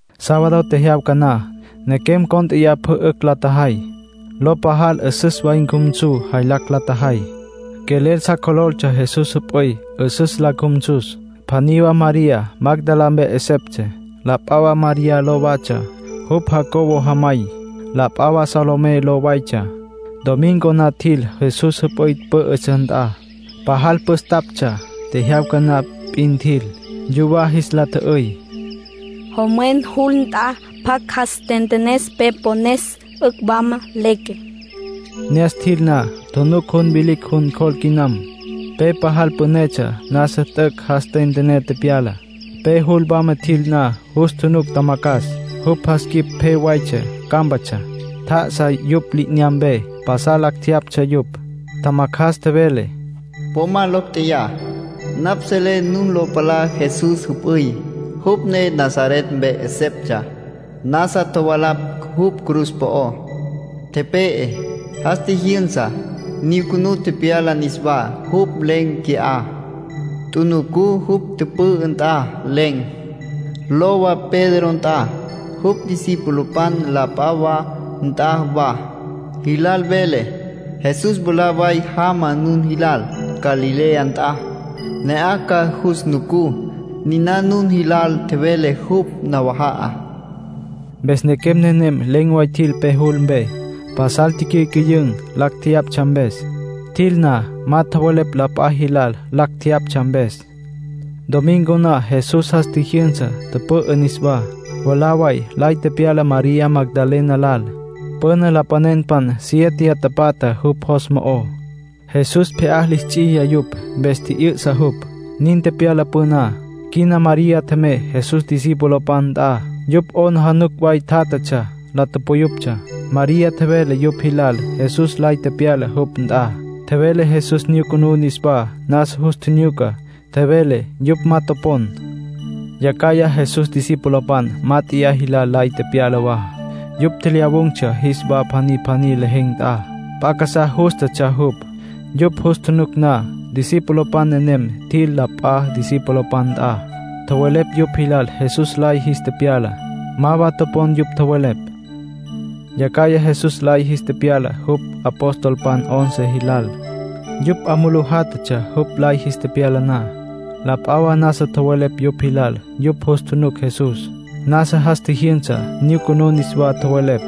Sábado tecyawaja na, nequem cónt'eya pjü 'ücj la tjajay. Lo pajal 'üsüs way cjumsu jaylacj la tjajay. Quelel sa cjololtsja Jesús jüp'üy 'üsüs la cjumsus. Pjaní wa María, Magdalá mpe 'eseptsja. La p'a wa María ló watsja, jupj Jacobo jamay. La p'a wa Salomé ló waytsja. Domingo na tjil Jesús jüp'üy pǘ'ütsja nt'a. Pajal püstaptsja, tjejyawca na p'in tjil. Yuwá jis la tjü'üy: “Jomwen jul nt'a, ¿pjacj ca jas ntentenes pe pones, 'ücj wama leque?” Ne'as tjil na, tjunuc jun vilicj jun cjol quinam. Pe pajal pünetsja nasa t'üc' jas tentené tepyala. Pe jul wama tjil na, jus tjunuc tjamacjas. Jupj jas quip pje waytsja, cámpatsja. Tjá'asa yupj li'inyampe. Pasal lacj jeyaptsja yupj. Tjamacjas tjevele: —Po ma locj tjeyá. Napj selé nun lo palá Jesús jüp'üy, jupj ne Nazaret mpe 'eseptsja. Nasa tjovalapj jupj cruz po'ó, tepe'e. ¡Jas tjijyünsa, nyucunú tepyala niswá! Jupj len̈ qui'á. Tjunucú jupj tüpü'ü nt'a. Len̈. Lowa Pedro nt'a, jupj discipulopan la p'a wa nt'a wa. Jilal mvelé: ‘Jesús mwalá way jama nun jilal Galilea nt'a. Ne'aj ca jus nucú. Niná nun jilal tjevele jupj nawaja'a.’ Mpes nequem nenem len̈ way tjil pe jul mpe. Pasal ticyücüyün̈, lacj tjeyaptsja mpes. Tjil na, ma tjowelepj la p'a jilal lacj tjeyaptsja mpes. Domingo na Jesús jas tjijyünsa, tüpü'ü niswá. Mwalá way lay tepyala María Magdalena lal. Püna lapanenpan siéteya tapatja jupj jos mo'ó. Jesús pje'á lis ts'iya yupj, mpes tji'yü'sa jupj. Nin tepyala püná. Quina María tjemey Jesús discipulopan nt'a. Yupj 'aplijila way tjátjatsja, la tupuyuptsja. María tjevele yupj jilal Jesús lay tepyala jupj nt'a. Tjevele Jesús nyucunú niswá, nasa jus tjinyuca, tjevele. Yupj ma topon. Yacjaya Jesús discipulopan mát'eya jilal lay tepyala wa. Yupj tjelyawun̈tsja jis wa pjaní pjaní lejen̈ nt'a. P'a casá jústatsja jupj, yupj jus tjunuc na. Discipulopan nenem tjil la p'a discipulopan nt'a. Tjowelepj yupj jilal Jesús lay jis tepyala. Ma wa topon yupj tjowelepj. Yacjaya Jesús lay jis tepyala jupj apostolpan once jilal. Yupj 'a mulú jalatsja jupj lay jis tepyala na. La p'a wa nasa tjowelepj yupj jilal yupj jus tjunuc Jesús. Nasa jas tjijyünsa, nyucunú niswá, tjowelepj.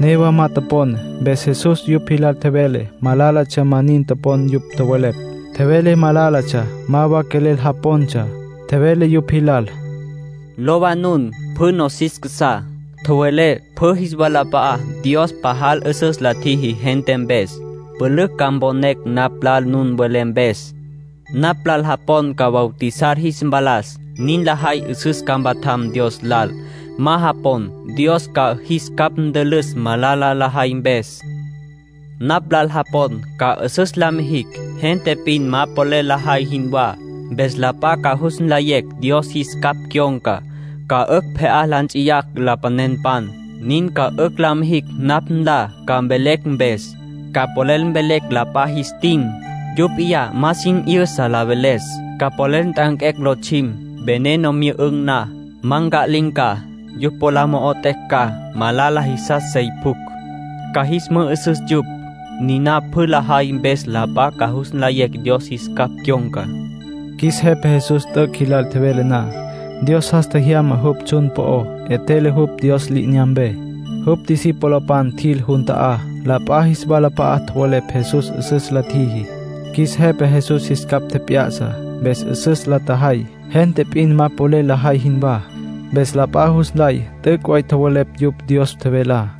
Newa ma topon. Mpes Jesús yupj jilal tjevele malálatsja ma nin topon yupj tjowelepj. Tjevele malálatsja ma wa quelel japontsja. Tjevele yupj jilal: “Lowa nun pjü nosis casá. Tjowelé pjü jis walap'a'á Dios pajal 'üsüs la tjiji gente mpes. Pülücj ca mponecj napj lal nun welé mpes. Napj lal japon ca bautizar jis mpalas. Nin lajay 'üsüs ca mpatjam Dios lal. Ma japon, Dios ca jis capj ntülüs malala lajay mpes. Napj lal japon ca 'üsüs la mijicj, gente p'in ma polel lajay jinwá. Mpes la p'a ca jus nlayecj Dios jis capj cyon̈ca. Ca 'ücj pje'á la nts'iyacj lapanenpan. Nin ca 'ücj la mijicj napj nlá ca mvelecj mpes. Ca polel mvelecj la p'a jis tin, yupj p'iyá ma sin 'yüsa la veles. Ca polel nt'anquecj lotsjim. Veneno myü'ün̈ na, ma nca'lin̈ ca. Yupj po la mo'ot'ecj ca malala jisas sey pjucj, ca jis mü'ü'süs yupj. Niná pjü lajay mpes la p'a ca jus nlayecj Dios jis capj cyon̈ca.” Qjuis Jepa Jesús t'üc' jilal tjevele na, Dios jas tjemyana jupj tsjun po'ó. 'Etjele jupj Dios li'inyampe. Jupj discipulopan tjil jun ta'á, la p'a jis walap'a'a tjowelepj Jesús 'üsüs la tjiji. Qjuis Jepa Jesús jis capj tjep'ya'sa. Mpes 'üsüs la tjajay, gente p'in ma polel lajay jinwá. Mpes la p'a jus nlay t'üc' way tjowelepj yupj Dios tjevelá.